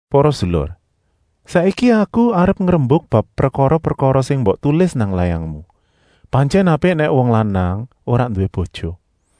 Para sedulur, saiki aku arep ngrembuk bab prekara-prekara sing mbok tulis nang layangmu. Pantyèn apik nèk wong lanang ora nduwé bojo.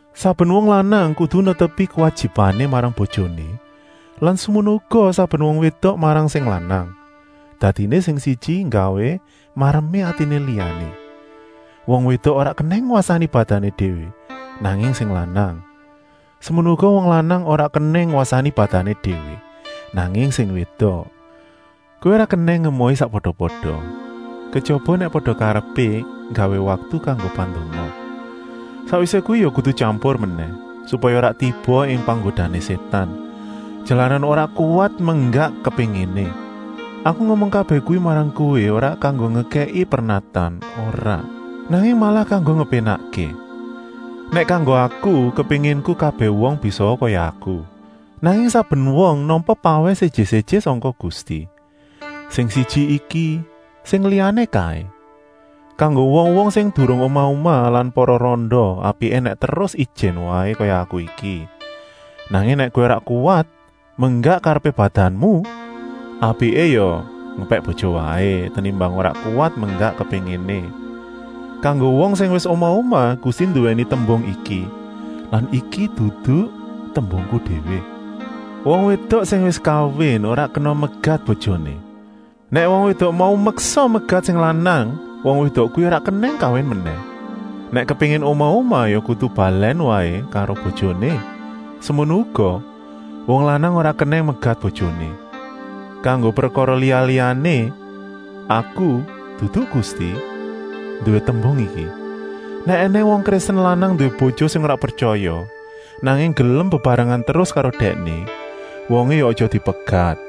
Saben wong lanang kudu netepi kuwajibané marang bojoné lan semono uga saben wong wédok marang sing lanang, dadiné sing siji nggawé maremé atiné liyané. Wong wédok ora kenèng ngwasani badané déwé, nanging sing lanang. Semono uga wong lanang ora kenèng ngwasani badané déwé, nanging sing wédok. Kowé ora kenèng ngemohi sakpada-pada, kejaba nèk pada karepé nggawé waktu kanggo pandonga. Sakwisé kuwi ya kudu tyampur menèh, supaya ora tiba ing panggodané Sétan, jalaran ora kuwat menggak kepénginé. Aku ngomong kabèh kuwi marang kowé ora kanggo ngekèki pernatan, ora, nanging malah kanggo ngepénakké. Nèk kanggo aku, kepénginku kabèh wong bisaa kaya aku. Nanging saben wong nampa pawèh séjé-séjé sangka Gusti, sing siji iki, sing liyané kaé. Kanggo wong-wong sing durung omah-omah lan para randa, apiké nèk terus ijèn waé kaya aku iki. Nanging nèk kowé ora kuwat menggak karepé badanmu, apiké ya ngepèk bojo waé, tenimbang ora kuwat menggak kepénginé. Kanggo wong sing wis omah-omah Gusti nduwèni tembung iki lan iki dudu tembungku déwé: “Wong wédok sing wis kawin ora kenèng megat bojoné.” Nèk wong wédok mau meksa megat sing lanang, wong wédok kuwi ora kenèng kawin menèh. Nèk kepéngin omah-omah ya kudu balèn waé karo bojoné. Semono uga, wong lanang ora kenèng megat bojoné. Kanggo prekara liya-liyané, aku, dudu Gusti, nduwé tembung iki: nèk ènèng wong Kristen lanang nduwé bojo sing ora pretyaya, nanging gelem bebarengan terus karo dèkné, wongé ya aja dipegat.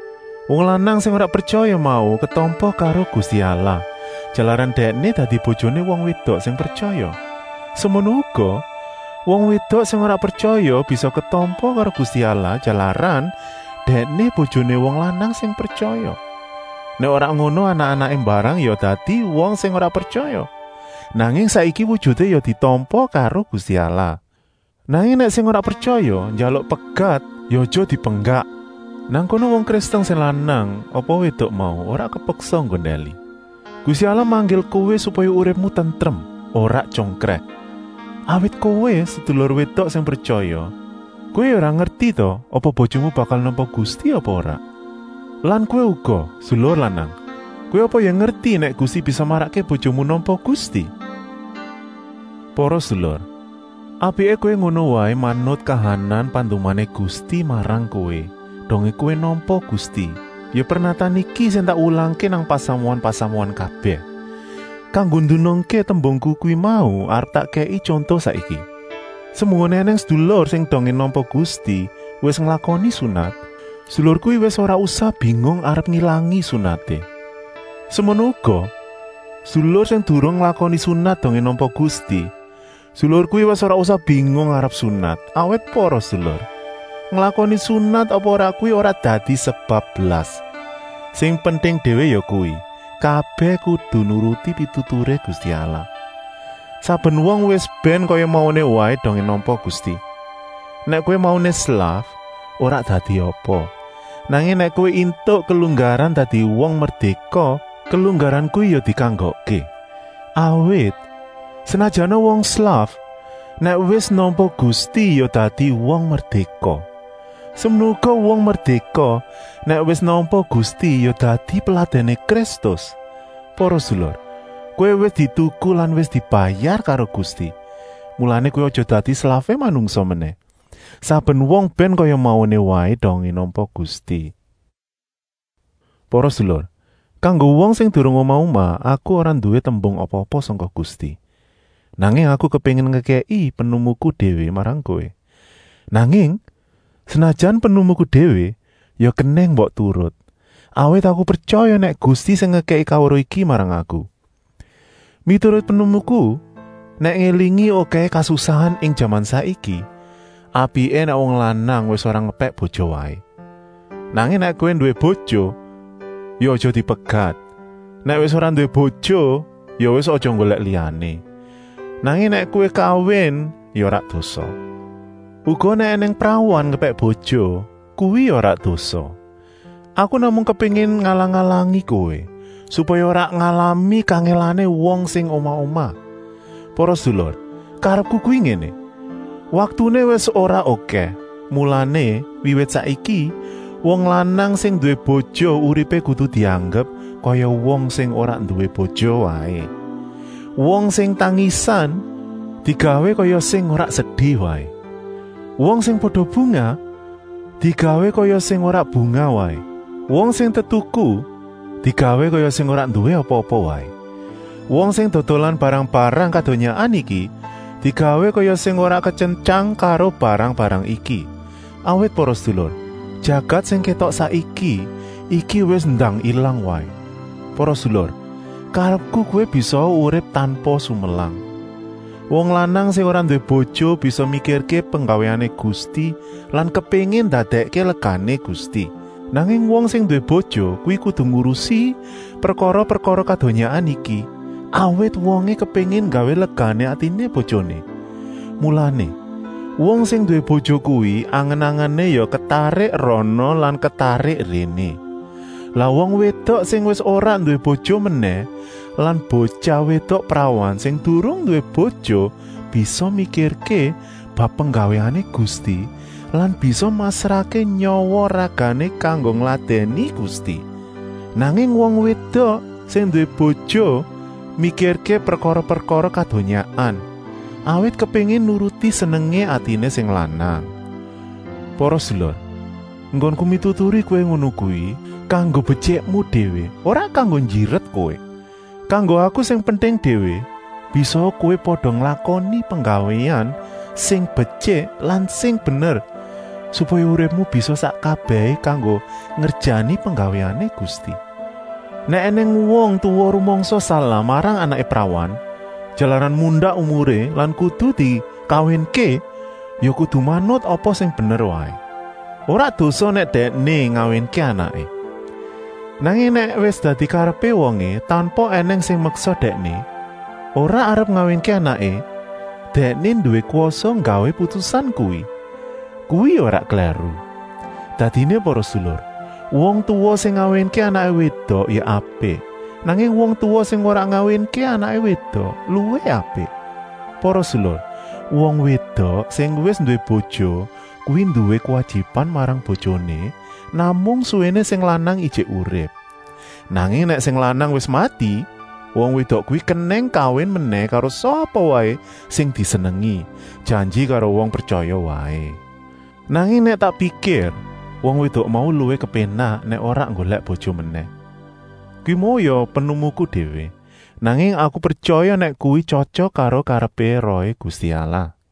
Wong lanang sing ora pretyaya mau ketampa karo Gusti Allah, jalaran dèkné dadi bojoné wong wédok sing pretyaya. Semono uga, wong wédok sing ora pretyaya bisa ketampa karo Gusti Allah, jalaran dèkné bojoné wong lanang sing pretyaya. Nèk ora ngono anak-anaké mbarang ya dadi wong sing ora pretyaya. Nanging saiki wujuté ya ditampa karo Gusti Allah. Nanging nèk sing ora pretyaya njaluk pegat ya aja dipenggak. Nang kono wong Kristen sing lanang apa wédok mau ora kepeksa nggondèli. Gusti Allah manggil kowé supaya uripmu tentrem, ora tyongkrèh. Awit kowé, sedulur wédok sing pretyaya, kowé ya ora ngerti ta apa bojomu bakal nampa Gusti apa ora. Lan kowé uga, sedulur lanang, kowé apa ya ngerti nèk kowé bisa marakké bojomu nampa Gusti? Para sedulur, apiké kowé ngono waé manut kahanan pandumané Gusti marang kowé, dongé kowé nampa Gusti. Ya pernatan iki sing tak wulangké nang pasamuan-pasamuan kabèh. Kanggo ndunungké tembungku kuwi mau arep tak kèki tyonto saiki! Semunggoné ènèng sedulur sing dongé nampa Gusti wis nglakoni sunat, sedulur kuwi wis ora usah bingung arep ngilangi sunaté. Semono uga, sedulur sing durung nglakoni sunat dongé nampa Gusti, sedulur kuwi wis ora usah bingung arep sunat. Awit para sedulur, nglakoni sunat apa ora kuwi ora dadi sebab blas. Sing penting déwé yakuwi, kabèh kudu nuruti pituturé Gusti Allah. Saben wong wis bèn kaya mauné waé dongé nampa Gusti. Nèk kowé mauné slaf, ora dadi apa. Nanging nèk kowé éntuk kelunggaran dadi wong merdéka, kelunggaran kuwi ya dikanggokké. Awit, senajana wong slaf, nèk wis nampa Gusti ya dadi wong merdéka. Semono uga wong merdéka, nèk wis nampa Gusti ya dadi peladèné Kristus. Para sedulur, kowé wis dituku lan wis dibayar karo Gusti. Mulané kowé aja dadi slafé manungsa menèh. Saben wong bèn kaya mauné waé dongé nampa Gusti. Para sedulur, kanggo wong sing durung omah-omah aku ora nduwé tembung apa-apa sangka Gusti, nanging aku kepéngin ngekèki pinemuku déwé marang kowé. Nanging, senajan pinemuku déwé, ya kenèng mbok turut, awit aku pretyaya nèk Gusti sing ngekèki kaweruh iki marang aku. Miturut pinemuku, nèk ngélingi okèhé kasusahan ing jaman saiki, apiké nèk wong lanang wis ora ngepèk bojo waé. Nanging nèk kowé nduwé bojo, ya aja dipegat. Nèk wis ora nduwé bojo, ya wis aja nggolèk liyané. Nanging nèk kowé kawin ya ora dosa. Uga nèk ènèng prawan ngepèk bojo, kuwi ya ora dosa. Aku namung kepéngin ngalang-alangi kowé, supaya ora ngalami kangèlané wong sing omah-omah. Para sedulur, karepku kuwi ngéné: waktuné wis ora okèh. Mulané, wiwit saiki, wong lanang sing nduwé bojo uripé kudu dianggep kaya wong sing ora nduwé bojo waé. Wong sing tangisan, digawé kaya sing ora sedi waé. Wong sing pada bungah, digawé kaya sing ora bungah waé. Wong sing tetuku, digawé kaya sing ora nduwé apa-apa waé. Wong sing dodolan barang-barang kadonyaan iki, digawé kaya sing ora ketyentyang karo barang-barang iki. Awit para sedulur, jagat sing kétok saiki iki wis ndang ilang waé. Para sedulur, karepku kowé bisaa urip tanpa sumelang. Wong lanang sing ora nduwé bojo bisa mikirké penggawéané Gusti lan kepéngin ndadèkké legané Gusti. Nanging wong sing nduwé bojo kuwi kudu ngurusi prekara-prekara kadonyaan iki, awit wongé kepéngin nggawé legané atiné bojoné. Mulané, wong sing nduwé bojo kuwi angen-angené ya ketarik rana lan ketarik réné. Lah wong wédok sing wis ora nduwé bojo menèh lan botyah wédok prawan sing durung nduwé bojo bisa mikirké bab penggawéané Gusti lan bisa masrahké nyawa-ragané kanggo ngladèni Gusti. Nanging wong wédok sing nduwé bojo mikirké prekara-prekara kadonyaan, awit kepéngin nuruti senengé atiné sing lanang. Para sedulur, enggonku mituturi kowé ngono kuwi kanggo betyikmu déwé, ora kanggo njiret kowé. Kanggo aku sing penting déwé, bisaa kowé pada nglakoni penggawéan sing betyik lan sing bener, supaya uripmu bisa sak kabèhé kanggo ngerjani penggawéané Gusti. Nèk ènèng wong tuwa rumangsa salah marang anaké prawan, jalaran mundak umuré lan kudu dikawinké, ya kudu manut apa sing bener waé. Ora dosa nèk dèkné ngawinké anaké. Nanging nèk wis dadi karepé wongé, tanpa ènèng sing meksa dèkné, ora arep ngawinké anaké, dèkné nduwé kwasa nggawé putusan kuwi. Kuwi ya ora klèru. Dadiné para sedulur, wong tuwa sing ngawinké anaké wédok ya apik, nanging wong tuwa sing ora ngawinké anaké wédok luwih apik. Para sedulur, wong wédok sing wis nduwé bojo kuwi nduwé kuwajiban marang bojoné namung suwéné sing lanang ijik urip. Nanging nèk sing lanang wis mati, wong wédok kuwi kenèng kawin menèh karo sapa waé sing disenengi, janji karo wong pretyaya waé. Nanging nèk tak pikir, wong wédok mau luwih kepénak nèk ora nggolèk bojo menèh. Kuwi mau ya pinemuku déwé, nanging aku pretyaya nèk kuwi tyotyok karo karepé Rohé Gusti Allah.